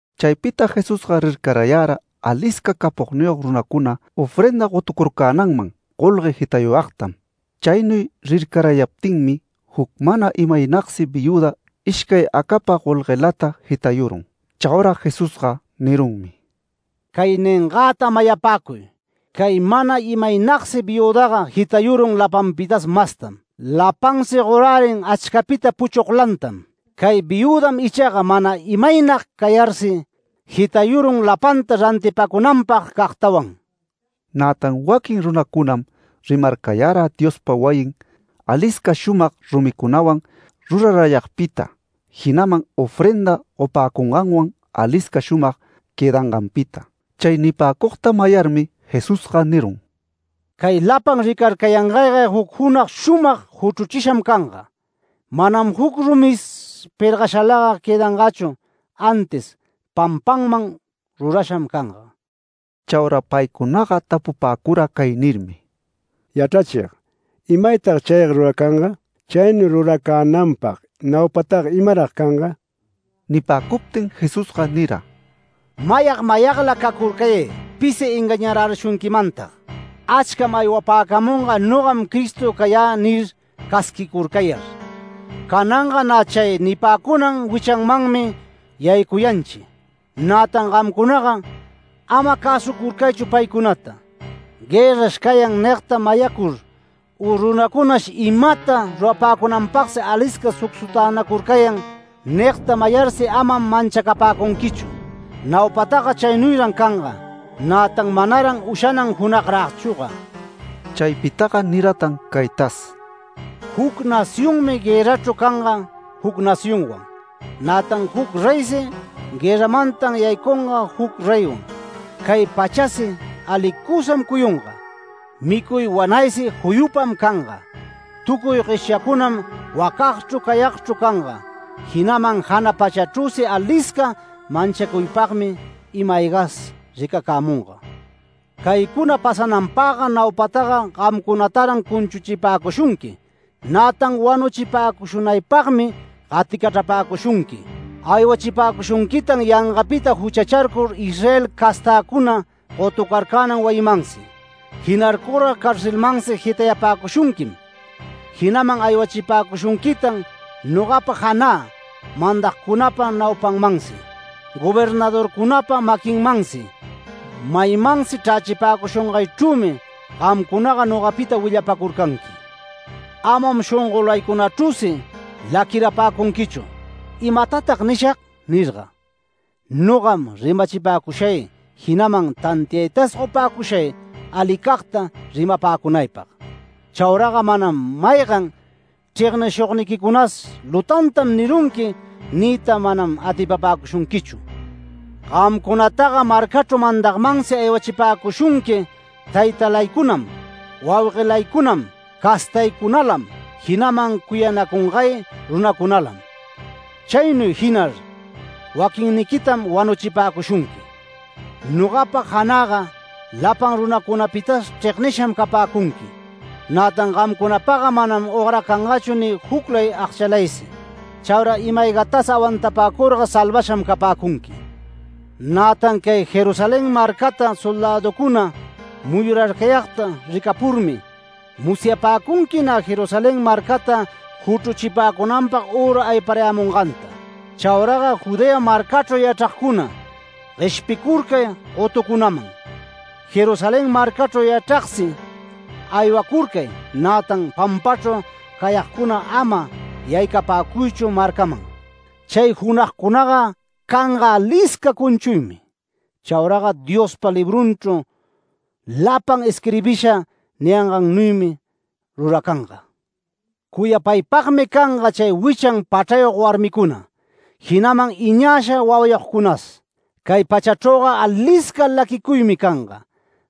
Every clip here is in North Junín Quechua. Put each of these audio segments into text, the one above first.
Chaypita Jesusga rircarayara alisca capogniyog runacuna ofrenda gotucurcänanman golgue jitayuyagtam. Chaynuy rircarayaptinmi juc mana imaynagsi viüda ishcay acapa golguelata jitayurun. Chaura Jesusga nirunmi: “Cay ningäta mayapäcuy: Cay mana imaynagsi viüdaga jitayurun lapanpitas mastam. Lapansi gorärin achcapita puchuglantam. Cay viüdam ichaga mana imaynag cayarsi, jitayurun lapanta rantipacunanpagcagtawan”. Nätan waquin runacunam rimarcayara Diospa wayin, alisca shumag rumicunawan rurarayagpita, jinaman ofrenda gopäcunganwan alisca shumag quëdanganpita. Chay nipäcugta mayarmi Jesús nirun: “Cay lapan ricarcayangayga juc junag shumag juchruchisham canga. Manam juc rumis pergashalaga quëdangachu, antis pampanman rurasham canga”. Chaura paycunaga tapupäcura cay nirmi: “Yachrachig, ¿imaytag chayga ruracanga? ¿Chaynuy ruracänanpag naupataga imarag canga?” Nipäcuptin Jesusga nira: “Mayag mayagla cacurcayay pisi engañarärishunquimantag. Achcam aywapäcamunga ‘Nogam Cristo cayä’ nir, casquicurcayar. Cananga nä chay nipäcunan wichanmanmi yaycuyanchi. Nätan gamcunaga ama cäsucurcaychu paycunata. ‘Guërrash cayan’ nigta mayacur u ‘Runacunash imata rurapäcunanpagsi alisca sucsutänacurcayan’ nigta mayarsi amam manchacapäcunquichu. Naupataga chaynuyran canga, nätan manaran ushanan junagragchüga”. Chaypitaga niratan caytas: “Juc nacionmi guërrachru canga juc nacionwan. Nätan juc reysi guërramantan yaycunga juc reywan, cay pachäsi alicusam cuyunga, micuy wanaysi juyupam canga, tucuy gueshyacunam wacagchru cayagchru canga, jinaman jana pachachrüsi alisca manchacuypagmi. ima-aygas ricacämunga. Caycuna cananpagga naupataga gamcunataran cunchuchipäcushunqui, nätan wanuchipäcushunaypagmi gaticachrapäcushunqui. Aywachipäcushunquitan yangapita juchacharcur Israel castäcuna gotucarcänan wayimansi. Jinarcurga carcelmansi jitayapäcushunquim. Jinaman aywachipäcushunquitan nogapa janä mandagcunapa naupanmansi, gobernadorcunapa maquinmansi. Maymansi chrächipäcushungaychrümi gamcunaga nogapita willapacurcanqui. Amam shongolaycunachrüsi laquirapäcunquichu ‘¿Imatatag nishag?’ nirga. Nogam rimachipäcushay, jinaman tantiaytas gopäcushay alicagta rimapäcunaypag. Chauraga manam maygan chregnishugniquicunas ‘Lutantam nirunqui’ niyta manam atipapäcushunquichu. Gamcunataga marcachru mandagmansi aywachipäcushunqui taytalaycunam, wauguelaycunam, castaycunalam, jinaman cuyanacungay runacunalam. Chaynuy jinar waquinniquitam wanuchipäcushunqui. Nogapa janäga lapan runacunapitas chregnisham capäcunqui. Nätan gamcunapagga manam ogracangachu ni juclay agchalaysi. Chaura ima-aygatas awantapäcurga salvasham capäcunqui. Nätan cay Jerusalén marcata soldäducuna muyurayagta ricapurmi, musyapäcunqui nä Jerusalén marcata juchruchipäcunanpag üra ayparayämunganta. Chauraga Judea marcachru yachragcuna, gueshpicurcay gotucunaman. Jerusalén marcachru yachragsi aywacurcay, nätan pampachru cayagcuna, ama yaycapäcuychu marcaman. Chay junagcunaga canga alisca cunchuymi. Chauraga Diospa librunchru lapan isquirbisha niyangannuymi ruracanga. Cuyapaypagmi canga chay wichan pachrayog warmicuna, jinaman iñasha wawayogcunas. Cay pachachrüga aliscam laquicuy canga.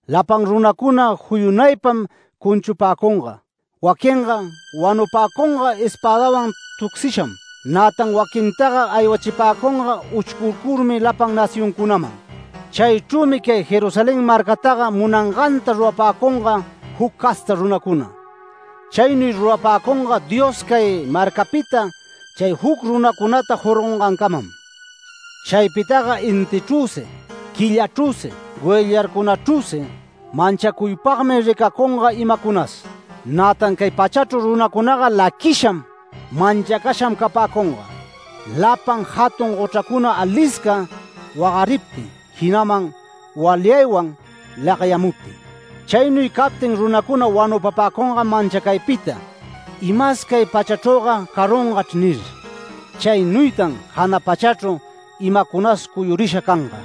Lapan runacuna juyunaypam cunchupäcunga. Waquinga wanupäcunga espädawan tucsisham, nätan waquintaga aywachipäcunga uchcurcurmi lapan nacioncunaman. Chaychrümi cay Jerusalén marcataga munanganta rurapäcunga juc casta runacuna. Chaynuy rurapäcunga Dios cay marcapita chay juc runacunata jorgongancamam”. “Chaypitaga intichrüsi, quillachrüsi, goyllarcunachrüsi manchacuypagmi ricacunga imacunas. Nätan cay pachachru runacunaga laquisham, manchacasham capäcunga, lapan jatun gochracuna alisca wagariptin, jinaman walyaywan lagyamuptin. Chaynuy captin runacuna wanupapäcungam manchacaypita ‘Imas cay pachachrüga carungachr’ nir, chaynuytan jana pachachru imacunas cuyurisha canga.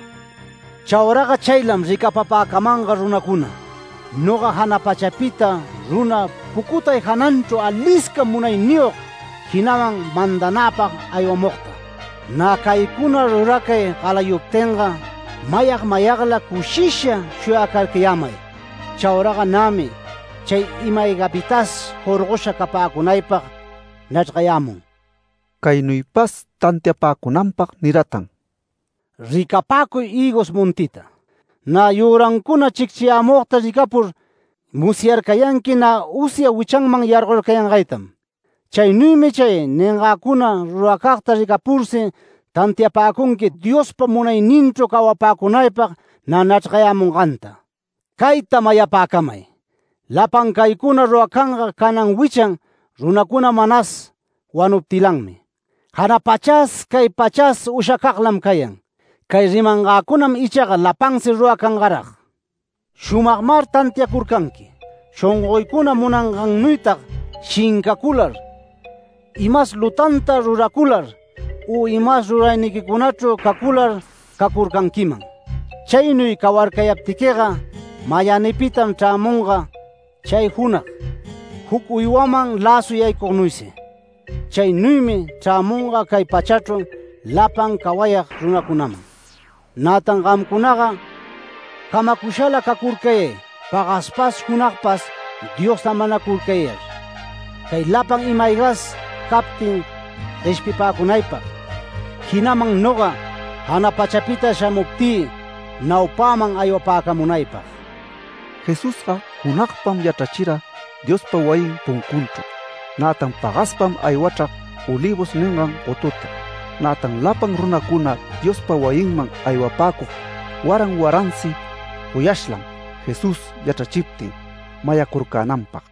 Chauraga chaylam ricapapäcamanga runacuna, noga jana pachapita runa pucutay jananchru alisca munayniyog, jinaman mandanäpag aywamugta. Nä caycuna ruracay galayuptinga, mayag mayagla cushisha shuyacarcayämay. Chauraga nämi chay ima-aygapitas jorgosha capäcunaypag nachrgayämun”. Caynuypas tantiapäcunanpag niratan: “Ricapäcuy hïgos montita. Nä yürancuna chicchiyämugta ricapurga musyarcayanqui nä usya wichanman yargorcayangaytam. Chaynuymi chay ningäcuna ruracagta ricapursi tantiapäcunqui Diospa munayninchru cawapäcunaypag nä nachrgayämunganta. Cayta mayapäcamay: Lapan caycuna ruracanga canan wichan runacuna manas wanuptilanmi. Jana pachas, cay pachas ushacaglam cayan. Cay rimangäcunam ichaga lapansi ruracangarag. Shumagmar tantiacurcanqui, shongoycuna munangannuytag shincacular, imas lutanta ruracular u imas rurayniquicunachru cacular cacurcanquiman. Chaynuy cawarcayaptiquiga mayänipitam chraramunga chay junag, juc uywaman läsu yaycugnuysi. Chaynuymi chrämunga cay pachachru lapan cawayag runacunaman. Nätan gamcunaga camacushala cacurcayay, pagaspas junagpas Diosta manacurcayar, cay lapan imas aygas captin gueshpipäcunaypag, jinaman noga, jana pachapita shamuptï naupäman aywapäcamunaypag”. Jesusga junagpam yachrachira Diospa wayin puncunchru, nätan pagaspam aywachrag Olivos ningan gotuta. Nätan lapan runacuna Diospa wayinman aywapäcug waran waransi goyashlam Jesús yachrachiptin mayacurcänanpag.